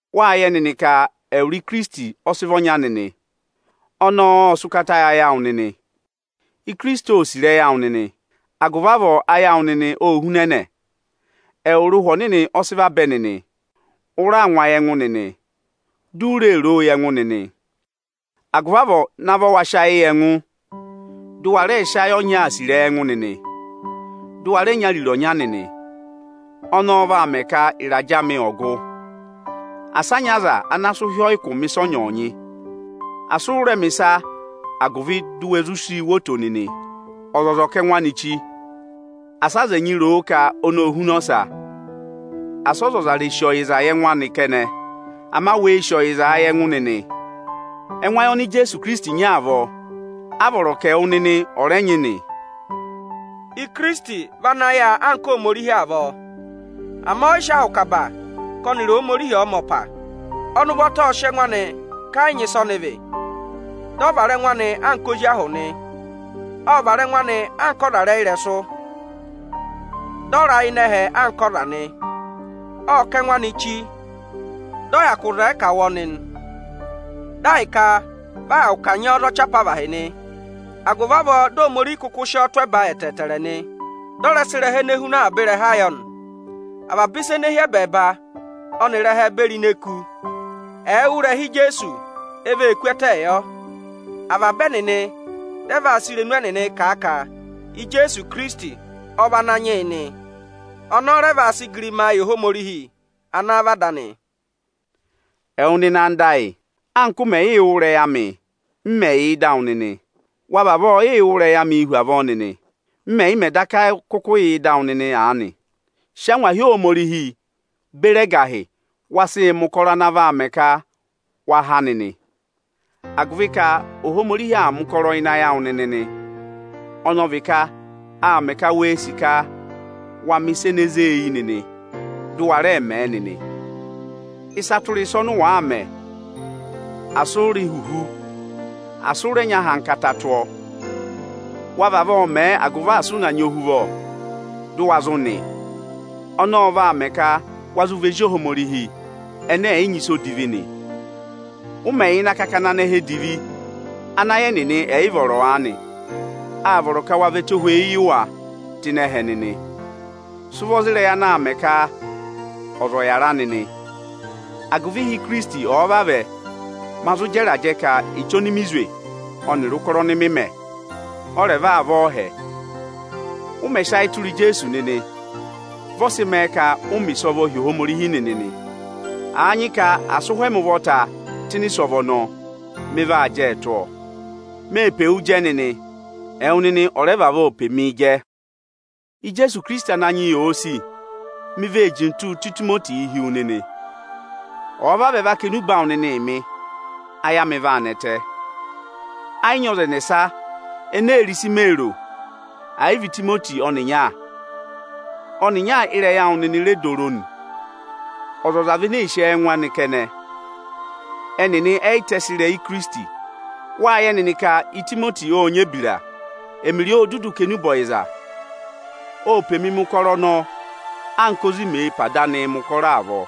Wáa yẹ nịnị ka ẹwụrị Ikirisiti ọ sị vị ọnya nịnị. Ọnọọ ộ sị ụkata yị ayị awụ nịnị. Ikirisiti óo sì ịrẹyị awụ nịnị, agụvị avọọ ayị awụ nịnị óo hunẹnẹ. Ẹwụrị Ụhwẹ Ọnịnị ọ sị vabẹ nịnị, ụ raa ngụ ayị ẹngụ nịnị, di u ree roo yị ẹngụ nịnị nị. Agụvị avọọ, navọ wa sị ayị yị ẹngụ, dị ụ wa rẹẹ sị ayị ọnyaa sì ịrẹyị ẹngụ nịnị, dị ụ wa rẹ nyị ariro ọnya nịnị. Ọnọọ vaa mẹ ka ịrajẹ amị ọ̀ gụ. Asị a nyị ọza ana sị ụhị ọyị kụ̀ mẹ ịsọnyị-ịsọnyị. Asị ụ rẹ mẹ̀ ịsa agụvị di u we zụ sii wo oto nịnị. Ọzọza ọ̀ kà ẹngụ anị chi, asị aza ẹnyị ro o ka ọnị óo huna ọsa. Asị ọzọza rè sì ọyịza yị ẹngụ anị kẹnẹ, ama wee sì ọyịzaa yị ẹngụ nịnị. Ẹngụ ayị oni Ijeesu nyị avọọ, a vọrọ ka ẹwụ nịnị ọ̀ rẹ nyị nị: Ikirisiti vị ana yà anka Ohomorihi avọọ, ama ẹ yị sị ahụ kà aba ka ọnịrị Ohomorihi ọ̀ọ mẹ ọpa. Ọnị ụvọta ộ sị ẹngụ anị ka ẹ yị nyị ịsị ọnị vị, ị ọ vara ẹngụ anị ozi ahụ nị. Ộ vara ẹngụ anị anka ọza rị ẹyịrẹsụ, dị ọ ra ịnị ẹhẹ anka ọza nị. Ộ kà ẹngụ anị chi, dị ọ hyakụ zẹẹ ka à wụ́ ọnị, dị ahịka vị a hyakụ kanyị ọ za ọchị apavahị nị. Agụvị avọọ di Ohomorihi kụkụ sị ọ tụ́ ẹba ẹtẹẹtẹrẹ nị; dị ọ rẹ sị ịrẹha ene huna avaba ịrẹha yọ nị. Avaba ịsa ene hi ẹbẹẹba ọnịrị ẹhẹ beri ini eku, ẹ̀ẹ wụ́ ịrẹha Ijeesu, e vee kú ẹtẹẹ yọ. Avaba ẹnịnị rẹ vaa sị irenu ẹnịnịị kà a ka Ijeesu Ikirisiti ọ vị Ananyị yị nị. Ọnọọ rẹ vaa sị igirima yị Ohomorihi ana vị Ada anị. Ẹwụ nịnị anda ayị, anka ụ mẹ̀ yịị wụ́ ịrẹyị amị, m mẹ̀ yà ịdị awụ nịnị, wa vavọọ yịị wụ́ ịrẹyị amịị hu avọọ nịnị, m mẹ̀ yị mẹ daka kụkụ yà ịdị awụ nịnị aanị. Sị angwahi Ohomorihi beri ẹgahị, wa sịị mẹ̀ ụkọrọ ana vaa mẹ ka wa há nịnị; agụvị ka Ohomorihi aa mẹ̀ ụkọrọ ịnị ayị awụ nịnị nị, ọnị ọ vị ka aa mẹ ka wee sì ka wa mẹ̀ ịsa ene zée eyi nịnị, dị ụ wa rẹẹ mẹẹ nịnị. Ịsa tụra ịsa ọnị ụ wàa mẹ, asị ụ rị ihuhu, asị ụ rẹ nyị ahankata tụ́ ọ nịnị. Wa vavọọ mẹ agụvị asị ụ na nyị ohuvọ, dị ụ wa zụ nị nịnị. Ọnọọ ọ vaa mẹ ka wa zụ vị ezi Ohomorihi ẹnẹ ẹ̀ yị nyị ịsa odivi nị. Ụ mẹ̀ yà ịnị akakana anẹhẹ edivi ana ayị ẹnịnị ẹ̀ yị vọrọ aanị, áa vọrọ ka wa vị ẹtohweyi yị wa tụ́ ịnị ẹhẹ nịnị. Sị ụvọ za ịrẹyị anaā mẹ ka ọza ọ̀ yàra nịnị, agụvị ịhị Ikirisiti ọ̀ọ vavẹ, ma zụ jẹ ịrajẹ ka echi ọnị mị zwe ọnịrị ụkọrọ ọnị mị mẹ, ọ rẹ̀ va vị ọọhẹ. Ụ mẹ̀ sị ayị tụra Ijeesu nịnị, vị ọ sị mẹẹ ka ụ mẹ̀ ịsọvọ hi Ohomorihi nịnị nị. Àa nyị ka à sị ụhwẹ ẹmị ụvọta tụ́ ịnị ịsọvọ ọnọọ, mị vaa jẹẹ tụ́ ọ. Mee pe wu jẹ nịnị, ẹwụ nịnị ọ̀ rẹ vavọọ pe mii jẹ. Ijeesu Ikirisiti Ananyị yị òo sì, mi vee jintuu tụ́ Itimotii hi wu nịnị. Ọ̀ọ vavẹ va kà enube awụ nịnịị mị, ayị amị vaa nẹtẹ. Ẹ yị nyị ọza ẹnẹsa ene ee ro ịsị mee ro, àyị vị Itimoti ọnịnya. Ọnịnya ịrẹyị awụ nịnị re dooro nị. Ọzọza vị ene ee sì ẹ́ẹngụ anị kẹnẹ. Ẹnịnị ẹ yị tẹsị ịrẹyị Ikirisiti. Wáa yẹ nịnị ka Itimoti ọ́ọ nyị ebira. Ẹmịrị ọ ô dudu kà enube ọyịza. Ô pe mi mẹ̀ ụkọrọ ọnọọ anka ozi mee pe ada anịị mẹ̀ ụkọrọ avọọ.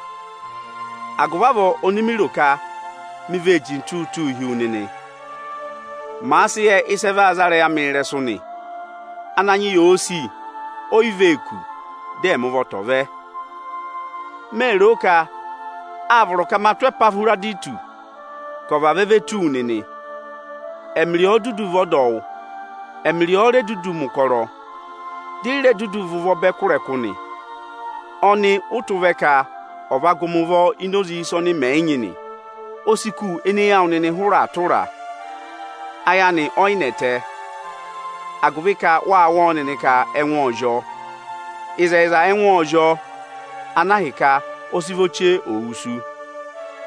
Agụvị avọọ, ọnị mị ro ka mi vee jintuu tụ́ụ hi wu nịnị, màa sị yẹ ịsị ẹ vaa za ịrẹyị amịị ịrẹsụ nị. Ananyị yị òo sì, ó yị vee kù, dị ẹmị ụvọta ọ̀ vẹ. Mèe roo ka áa vọrọ ka ma tụ́ Ẹpahwịrọdịtụsị vavẹ ve tù wu nịnị. Ẹmịrị ọ dudu vị ọdọwụ. Ẹmịrị ọ ore dudu mẹ̀ ụkọrọ, di i re dudu và ụvọ bẹ kụ́ ịrẹkụ nị. Ọnị ụ tụ́ vẹ nịnị ka ọ̀ va gụ mị ụvọ ini oze ịsa ọnị mẹ yị nyị nị. O si kù ene eyi awụ nịnị hụrẹ aa tụra a. Ayị amị ọ yị nẹtẹ, agụvị ka wâ wụ́ ọ nịnị ka ẹngụ ộ zị ọ. Ịzẹyịza ẹngụ ộ zị ọ, ana ahịka ọ sị vọ chee ò wusu.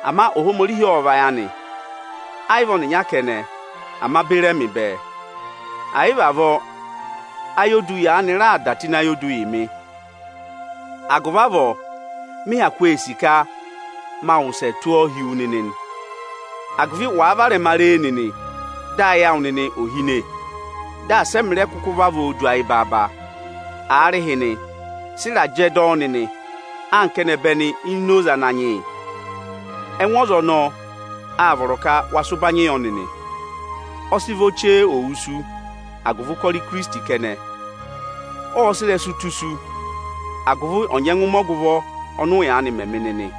Ama Ohomorihi ộ vayị anị; ẹ yị vị ọnịnya kẹnẹ, ama beri ẹmị bẹẹ. Àa yị vị avọọ, ayodu yaanị raà dà tụ ịnị ayodu yị mị. Agụvị avọọ, mị hyakụ ee sì ka ma wụsẹ tụ ọ hi wu nịnị nị, agụvị wàa rẹ varẹma re e nịnị, dị ayị awụ nịnị òo hine, dị asị ẹmị rẹ kụkụ vavọọ du ayị baaba. Aarịhịnị, sị ịrajẹ dọ ọ nịnị anka ẹnẹbẹnị ini oze Ananyị yị. Ẹngụ ọza ọnọọ, aa vọrọ ka wa sị ụbanyị yọ nịnị. Ọ sị vọ chee ò wusu agụvị ụkọrọ Ikirisiti kẹnẹ. Ộ sị ịrẹsụ tụ́ isu, agụvị ọ̀ nyẹngụ mẹ ọgụvọ ọnị ụ yaanị mẹ yị mị nịnị.